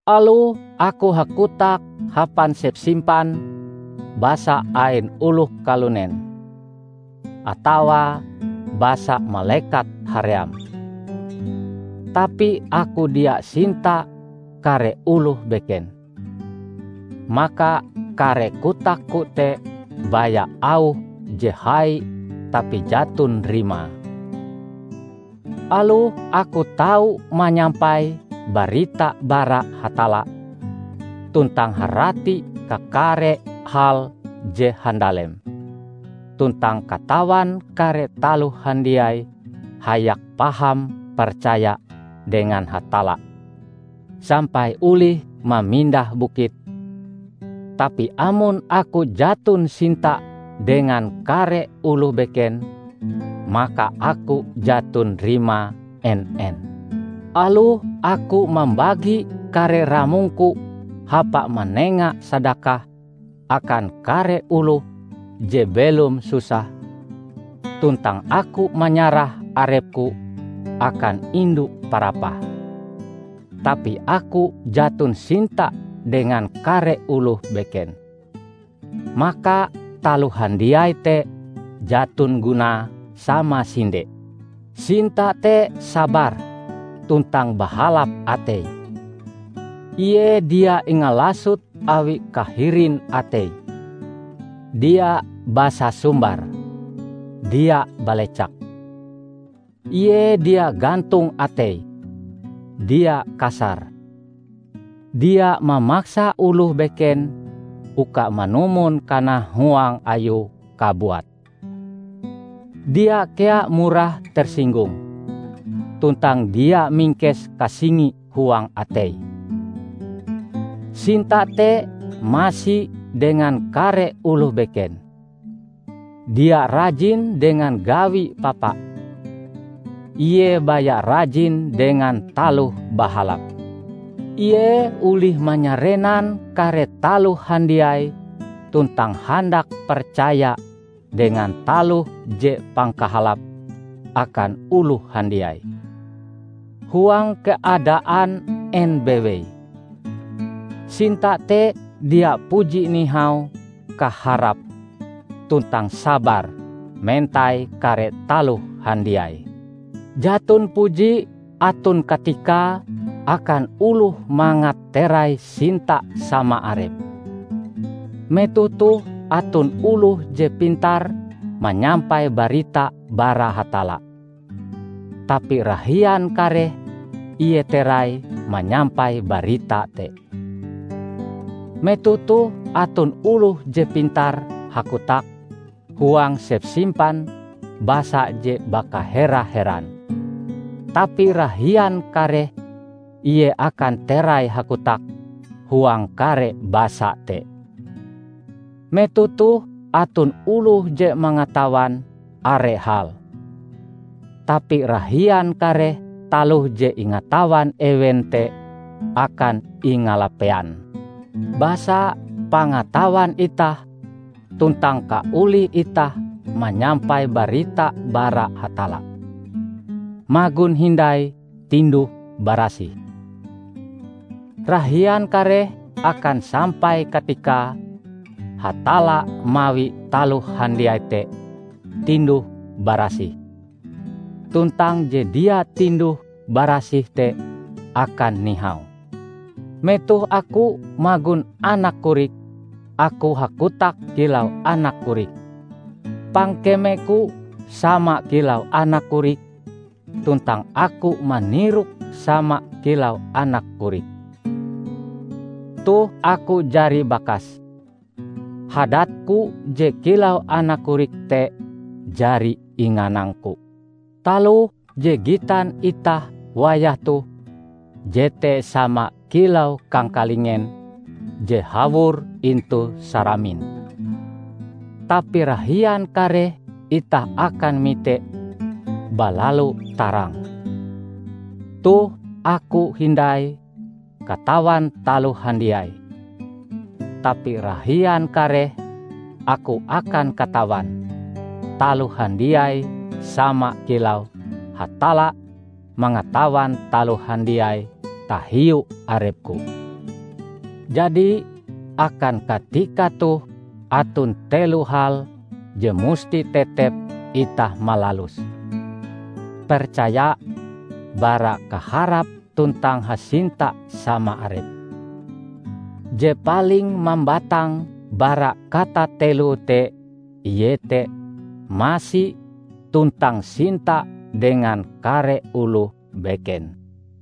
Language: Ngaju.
Aloh aku hakotak hapan sepsimpan basa ain oloh kalunen, atawa basa malekat haream, tapi aku dia sinta kare oloh beken, maka kare kotakku te baya auh je hai tapi jaton rimae. Aloh aku tau manyampai barita bara Hatalla, tuntang harati kakare hal je handalem, tuntang katawan kare taloh handiai hayak paham percaya dengan Hatalla sampai olih mamindah bukit, tapi amon aku jaton sinta dengan kare oloh beken, maka aku jaton rimae en-en! Aloh aku mambagi kare ramongku hapa manenga sadakah akan kare oloh je belom susah, tuntang aku manyarah arepku akan indu parapah, tapi aku jaton sinta dengan kare oloh beken, maka taloh handiai te jaton gunae samasinde. Sinta te sabar tuntang bahalap atei. Ie dia ingalasot awi kahirin atei, dia basasumbar, dia balecak. Ie dia gantong ateie, dia kasar, dia mamaksa oloh beken uka manumon kanahuang ayue kabuat, dia kea murah tersinggung, tuntang dia mingkes kasingi huang ateie. Sinta te masi dengan kare oloh beken, dia rajin dengan gawi papa, ie baya rajin dengan taloh bahalap. Ie olih manyarenan kare taloh handiai tuntang handak percaya dengan taloh je pangkahalape akan oloh handiai; huang keadaan en bewei, sinta te dia puji nihau kaharape tuntang sabar mentai kare taloh handiai. Jaton puji aton katikae akan oloh mangat terai sinta sama arepe. Metoh toh aton oloh je pintar manyampai barita bara Hatalla, tapi rahian kareh ie terai manyampai barita te. Metoh toh aton oloh je pintar hakotak huang sepsimpan basa je bakahera-heran, tapi rahian kareh ie akan terai hakotak huang kare basa te. Metoh toh aton oloh je mangatawan are hal, tapi rahian kareh taloh je ingatawan ewen te akan ingalapean. Basa, pangatawan itah tuntang kaolih itah manyampai barita bara Hatalla, magon hindai tinduh-barasih. Rahian kareh akan sampai katikae Hatalla mawi taloh handiai te tinduh-barasih, tuntang je dia tinduh-barasih te akan nihau. Metoh aku magon anak korik, aku hakotak kilau anak korik, pangkemeku sama kilau anak korik tuntang aku manirok sama kilau anak korik. Toh aku jari bakas; hadatku je kilau anak korik te jari inganangku. Taloh je gitan itah wayah toh jete sama kilau kangkalingen je hawor intu saramin. Tapi rahian kareh itah akan mite balalu tarang. Toh aku hindai katawan taloh handiai, tapi rahian kareh aku akan katawan taloh handiai sama kilau Hatalla mangatawan taloh handiai tahiu arepku. Jadi, akan katika toh aton telo hal je musti tetep itah malaluse: percaya, bara kaharap tuntang hasinta sama arep. Je paling mambatang bara katateloe te iete masi tuntang sinta dengan kare oloh beken.